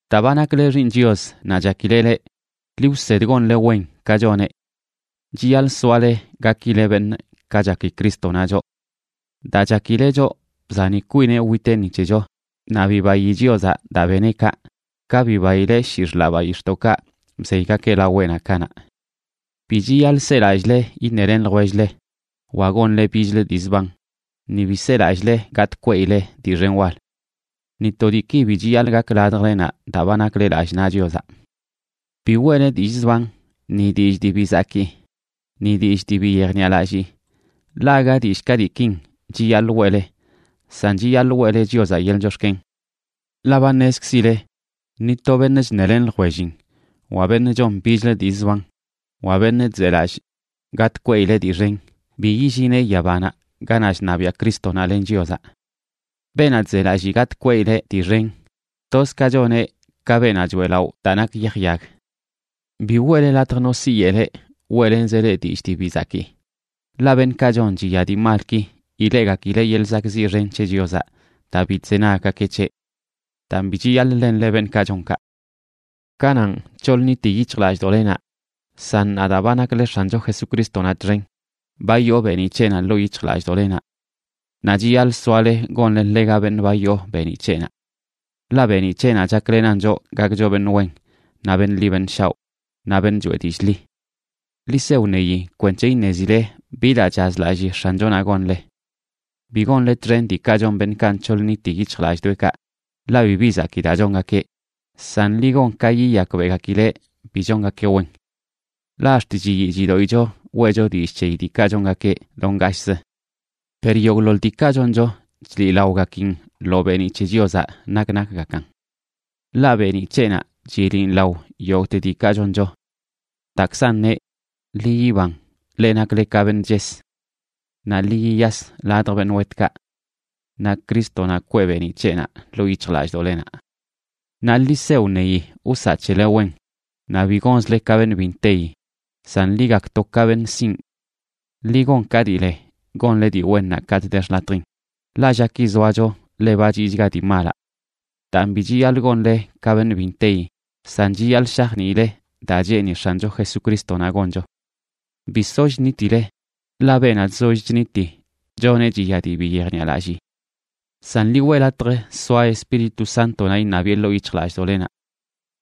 Daa ba nakle xiiṉ Chios naꞌ chakileꞌ leꞌ, ḻi wsed gonle wen ka choneꞌ. Chiyaḻꞌ soale gakile beṉꞌ, ka chaki Crístonaꞌ choꞌ. Daa chakileꞌ choꞌ, bzani kwineꞌ witeꞌ ni c̱hecho, naꞌ bibayi Chiozaꞌ daa beneꞌ kaꞌ, ka bibaileꞌ shii xḻaꞌ bayix̱ꞌdoꞌkaꞌ bzeygakeꞌ laweꞌnaꞌ kanaꞌ. Bi chiyaḻꞌ selallꞌle iṉelen ljwell-le wa gonle bichlə dii zban, ni bi selallꞌle gatꞌ kweꞌile dii xen wal. Ni to diiki bi chiyaḻꞌ gak ladjlenaꞌ daa ba nakle lallꞌ naꞌ Chiozaꞌ. Bi weꞌle dillꞌ zban, ni dillꞌ dii bi zakii ni dillꞌ dii bi yejniꞌalallii, ḻaꞌ aga dillꞌ ka diikin chiyaḻꞌ weꞌle, san chiyaḻꞌ weꞌle Chiozaꞌ yeḻꞌ chox̱ken. Ḻaꞌ ba ṉezkzile ni to beṉꞌ chṉelen ljwellin, wa beṉꞌ chon bichlə dii zban, wa beṉꞌ chzelallꞌ gatꞌ kweꞌileꞌ dii xen, bi yillineꞌ yabanaꞌ ganaꞌ chṉabiaꞌ Crístonaꞌ len Chiozaꞌ. Beenaꞌ chzelallii gatꞌ kweꞌileꞌ dii xen, toz ka choneꞌ ka beenaꞌ choeꞌlaꞌo daa nak yaj yag. Bi weꞌle latj no siyeꞌ leꞌ weꞌlenzeꞌ leꞌ dillꞌ dii bi zakii, ḻaꞌ beṉꞌkaꞌ chon chiya dii malki, ileꞌgakileꞌ yeḻꞌ zakꞌziꞌ xen c̱he Chiozaꞌ daa bi chzenaggakeꞌ c̱heꞌ. Daan, bi chiyaḻꞌ ḻenle beṉꞌkaꞌ chon kaꞌ. Kananꞌ, nc̱hoḻ nniti yic̱hjlallꞌdoꞌlenaꞌ, san ṉaa daa ba nakle X̱ancho Jesucrístonaꞌ txen, ba yoo beeniꞌ c̱heꞌnaꞌ ḻoo yic̱hjlallꞌdoꞌlenaꞌ, naꞌ chiyaḻꞌ soale gonle ḻega beṉꞌ ba yoo beeniꞌ c̱heꞌnaꞌ. Ḻaꞌ beeniꞌ c̱heꞌnaꞌ chaklenan choꞌ gakcho beṉꞌ wen, naꞌ beṉꞌ ḻi beṉꞌ shaoꞌ, naꞌ beṉꞌ choeꞌ dillꞌ ḻi. Ḻi se wṉeyi kwenc̱he iṉezile bi daa chazlalli X̱anchonaꞌ gonle. Bi gonle txen diikaꞌ chon beṉꞌkaꞌ nc̱hoḻ nniti yic̱hjlallꞌdoꞌekaꞌ, ḻaꞌ bibi zakii daa chongakeꞌ, san ḻi gon ka yiyakbeꞌgakileꞌ bi chongakeꞌ wen. Ḻaꞌ ax̱t chiyii chidoꞌicho weꞌcho dillꞌ c̱heyi diikaꞌ chongakeꞌ do ngashꞌzə. Per yogꞌḻoḻ diikaꞌ choncho, chliꞌlaogakin lo beeniꞌ c̱he Chiozaꞌ nak nakgakan. Ḻaꞌ beeniꞌ c̱heꞌnaꞌ chiliꞌn lao yogꞌte diikaꞌ choncho. Daakzan neꞌ: Ḻi yiban, leꞌ nakle ka beṉꞌ ches; naꞌ ḻi yiyas ladj beṉꞌ wetkaꞌ. Naꞌ Crístonaꞌ kwee beeniꞌ c̱heꞌnaꞌ ḻoo yic̱hjlallꞌdoꞌlenaꞌ. Naꞌ ḻi se wṉeyi wsaꞌ c̱hele wen, naꞌ bi gonzle ka beṉꞌ bi nteyi, san ḻi gakto ka beṉꞌ sinꞌ. Ḻi gon ka dii le gonle dii wennaꞌ katꞌ de xḻatjin, ḻaꞌ llaki zoacho ḻe ba chiꞌchga dii malaꞌ. Daan, bi chiyaḻꞌ gonle ka beṉꞌ bi nteyi, san chiyaḻꞌ shajniile daa cheeni X̱ancho Jesucrístonaꞌ goncho. Bi soll ṉitile, ḻaꞌ beenaꞌ chzoll chniti choneꞌ chiya dii bi yejniꞌalallii. San ḻi weꞌ latj soa Espíritu Sántonaꞌ iṉabiꞌe ḻoo yic̱hjlallꞌdoꞌlenaꞌ.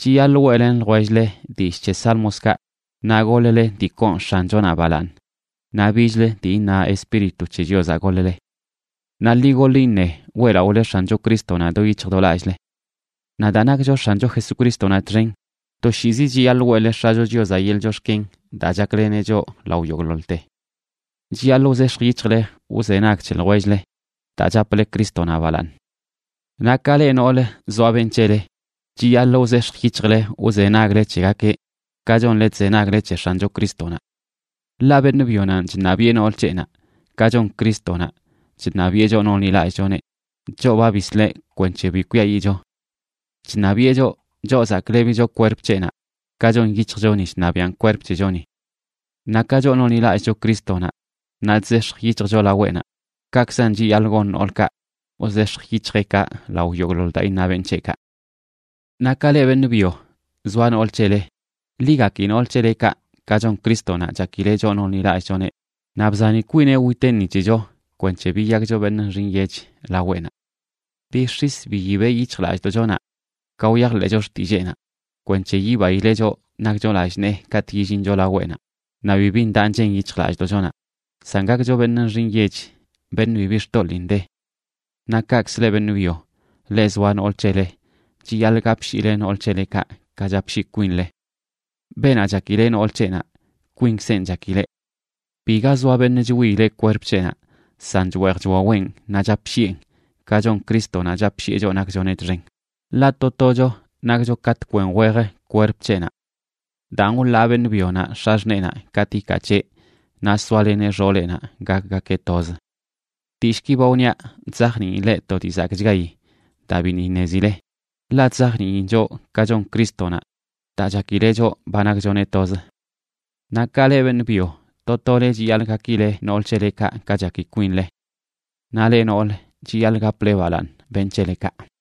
Chiyaḻꞌ weꞌlen ljwell-le dillꞌ c̱he sálmokaꞌ, naꞌ goḻ-le dii koon X̱anchonaꞌ balaaṉ naꞌ bichlə dii iṉa Espíritu c̱he Chiozaꞌ goḻ-le. Naꞌ ḻi goḻ iṉe weꞌlaꞌole X̱ancho Crístonaꞌ do yic̱hj do lallꞌle. Naꞌ daa nakcho X̱ancho Jesucrístonaꞌ txen, toshiizi chiyaḻꞌ weꞌle X̱acho Chiozaꞌ yeḻꞌ chox̱ken daa chakleneꞌ choꞌ lao yogꞌḻoḻte. Chiyaḻꞌ wzex̱j yic̱hjle wzenag c̱he ljwell-le, daa chaple Crístonaꞌ balaaṉ. Naꞌ ka leꞌ noolə zoa beṉꞌ c̱hele, chiyaḻꞌ wzex̱j yic̱hjle wzenagle c̱hegakeꞌ, ka chonle chzenagle c̱he X̱ancho Crístonaꞌ. Ḻaꞌ beṉꞌ byonanꞌ chṉabiꞌe nool c̱heꞌnaꞌ, ka chon Crístonaꞌ chṉabiꞌe choꞌ nonḻilallꞌchoneꞌ, choꞌ ba bisleꞌ kwenc̱he bi kwiayiꞌcho. Chṉabiꞌe choꞌ, choꞌ zaklebicho kwerp c̱heꞌnaꞌ, ka chon yic̱hjchoni chṉabiꞌan kwerp c̱hechoni. Naꞌ ka choꞌ nonḻilallꞌcho Crístonaꞌ naꞌ chzex̱j yic̱hjcho laweꞌnaꞌ, kaꞌkzan chiyaḻꞌ gon noolkaꞌ wzex̱j yic̱hjeꞌkaꞌ lao yogꞌḻoḻ daa iṉa beṉꞌ c̱heꞌkaꞌ. Naꞌ ka leꞌ beṉꞌ byo zoa nool c̱hele, ḻi gaki nool c̱helekaꞌ, ka chon Crístonaꞌ chakileꞌ choꞌ nonḻilallꞌchoneꞌ naꞌ bzani kwineꞌ witeꞌ ni c̱hecho kwenc̱he biyakcho beṉꞌ nxi nyech laweꞌnaꞌ. Bix̱is biyibeꞌ yic̱hjlallꞌdoꞌchonaꞌ ka wyajḻeꞌcho xtilleenaꞌ kwenc̱he yibaileꞌ choꞌ nakcho lallꞌ nee katꞌ yillincho laweꞌnaꞌ naꞌ bibi ndaꞌ nchen yic̱hjlallꞌdoꞌchonaꞌ, san gakcho beṉꞌ nxi nyech, beṉꞌ bibi xtoḻiin de. Naꞌ kaꞌkzə leꞌ beṉꞌ byo, leꞌ zoa nool c̱hele, chiyaḻꞌ gapshiile nool c̱helekaꞌ ka chapshii kwinle. Beenaꞌ chakileꞌ nool c̱heꞌnaꞌ, kwinkzenꞌ chakileꞌ. Biga zoa beṉꞌ chwiileꞌ kwerp c̱heꞌnaꞌ, san chweej chwaweꞌn naꞌ chapshiꞌen, ka chon Crístonaꞌ chapshiꞌe choꞌ nakchoneꞌ txen, ḻaꞌ to tocho nakcho ka tkwen wej kwerp c̱heꞌnaꞌ. “Daan, wḻaa beṉꞌ byonaꞌ x̱axṉeenaꞌ katꞌ ikaa c̱heꞌ, naꞌ soaleneꞌ xooleꞌnaꞌ gakgakeꞌ toz.” Dillꞌki ba wniaꞌ chzajniin leꞌ to dii zakꞌchgayi daa biṉꞌ iṉezileꞌ, ḻaꞌ chzajniin choꞌ ka chon Crístonaꞌ daa chakileꞌ choꞌ ba nakchoneꞌ toz. Naꞌ ka leꞌ beṉꞌ byo, to tole chiyaḻꞌ gakileꞌ nool c̱helekaꞌ ka chaki kwinle. Naꞌ leꞌ noolə, chiyaḻꞌ gaple balaaṉ beṉꞌ c̱helekaꞌ.